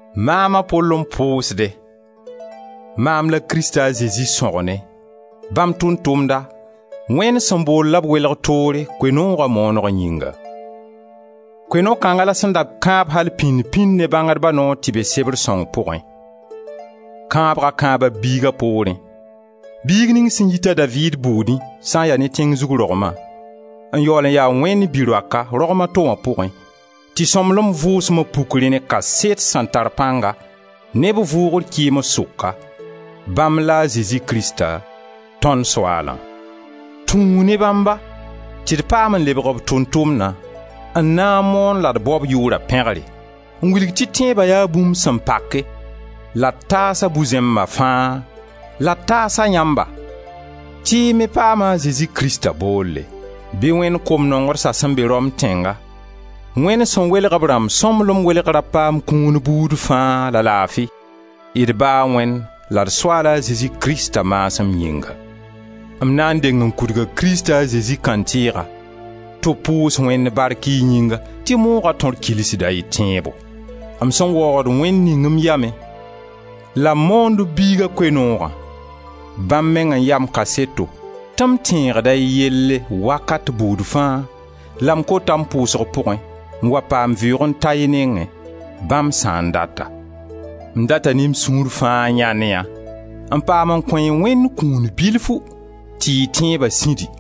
Maam, a Pol, n pʋʋsde; maam la Krist a Zezi sõgne, bãmb Tʋʋm-tʋmda, Wẽnd sẽn bool la b welg toore Koe-nooga mooneg yĩnga. Koe-noog kãnga la sẽn da kãab al-pĩnd pĩnd ne bãngdba noor tɩ be Sebr sõng pʋgẽ. Kãabga kãaba b Biiga poorẽ, biig ning sẽn yit a Daviid buudẽ sã n ya ne tẽng zug rogma, n yaool n ya Wẽnd bi-roaka, rogm a to wã pʋgẽ, tɩ Sõmblem Vʋʋsma puk rẽ ne kaset sẽn tar pãnga, ne b vʋʋgr kɩɩms sʋka, bãmb la a Zezi Krista tõnd Soaalã. Tũu ne bãmba tɩ d paam n lebg b tʋʋm-tʋmdã n na n moon la d bao b yʋʋra pẽgre, n wilg tɩ tẽeba yaa bũmb sẽn pake, la d taas-a bu-zẽmba fãa, la d taas-a yãmba, tɩ y me paama a Zezi Krista boolle. Bɩ Wẽnd kom-nongdsã sẽn be Rom tẽnga, Wẽnd sẽn welg b rãmb sõmblem welgrã paam kũun buud fãa la laafi, d Ba a Wẽnd la d Soaala Zezi Krista maasem yĩnga. M na n deng n kudga Krista a Zezi kãntɩɩga tɩ b pʋʋs Wẽnd bark y yĩnga tɩ mooga tõr kilsda y tẽebo. M sẽn waoogd Wẽnd ning m yamẽ la m moond b Biiga Koe-noogã, bãmb meng n ya m kaseto, tɩ m tẽegda y yelle wakat buud fãa, la m kota m pʋʋsg pʋʋgẽ, n wa paam vɩʋʋg n ta y nengẽ, bãmb sã n data. M rata ne m sũur fãa n yãend yã n paam n kõ-y ye Wẽnd kũun bilfu tɩ y tẽeba sĩdi,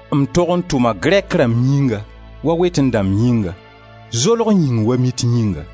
M tog n tʋma Grɛk rãmb yĩnga wa wetẽ dãmba yĩnga, zolg yĩng wa mit yĩnga.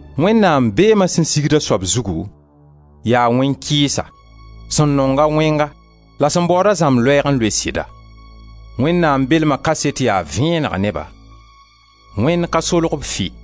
Wẽnnaam beema sẽn sigd a soab zugu, yaa wẽn-kɩɩsa, sẽn nong-a wẽnga la sẽn baood-a zãmb loɛɛg n loe sɩda. Wẽnnaam beelma kaset yaa vẽeneg ne-ba. Wẽnd ka solg-b fɩ.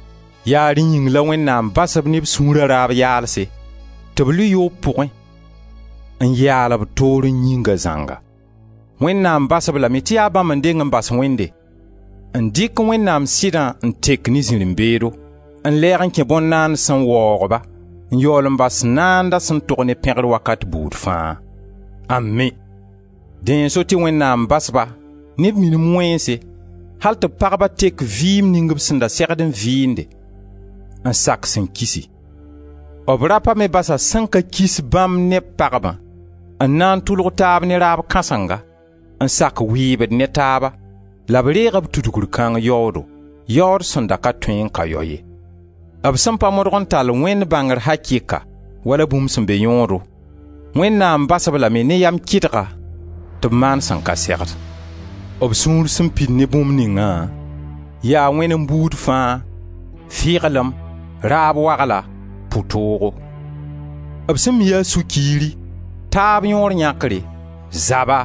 Yaa rẽ yĩng la Wẽnnaam bas-b ne b sũura raab yaalse tɩ b lʋɩ yoob pʋgẽ n yaal b toorẽ yĩnga zãnga. Wẽnnaam bas-b lame tɩ yaa bãmb n deng n bas Wẽnde, n dɩk Wẽnnaam sɩda n tek ne zirẽ-beedo, n lɛɛg n kẽ bõn-naands n waoog-ba, n yaool n bas Naanda sẽn tog ne pẽgr wakat buud fãa. (Ami!) Dẽ n so tɩ Wẽnnaam bas-ba ne b minim wẽnse, al tɩ b pagba tek vɩɩm ning b sẽn da segdẽ n vɩɩnde, n sak sẽn kisi. B rapa me basa sẽn ka kis bãmb ne b pagbã, n na n tʋlg taab ne raab kãsenga, n sak wɩɩbd ne taaba la b reega b tudgr kãng yaoodo, yaood sẽn da ka tõe n ka yao ye. B sẽn pa modg n tall Wẽnd bãngr akɩka, wala bũmb sẽn be yõodo, Wẽnnaam bas-b lame ne yam kɩdga tɩ b maan sẽn ka segd. B sũur sẽn pid ne bũmb ningã, yaa wẽnem buud fãa, fɩglem, raab wagla, pu-toogo; b sẽn mi yaa sũ-kiiri, taab yõor yãkre, zaba,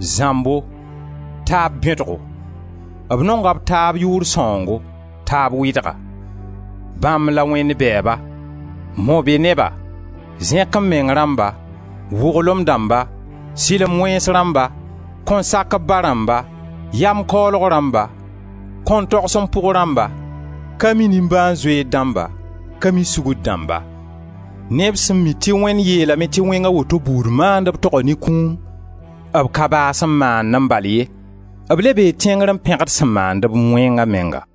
zãmbo, taab bẽdgo; b nonga b taab yʋʋr sãoongo, taab wɩdga. Bãmb la Wẽnd bɛɛba, mo-be-neba, zẽk-m-meng rãmba, wʋglem dãmba, sɩlem wẽns rãmba, kõn-sak-b-ba rãmba, yam kaoolg rãmba, kõn-togs-m-pʋg rãmba, ka mi nimbãan-zoeer dãmba, ka mi sugr dãmba. Ne b sẽn mi tɩ Wẽnd yeelame tɩ wẽng a woto buud maandb toga ne kũum, b ka baas n maandẽ bal ye, b le be tẽngre n pẽgd sẽn maand-b wẽnga menga.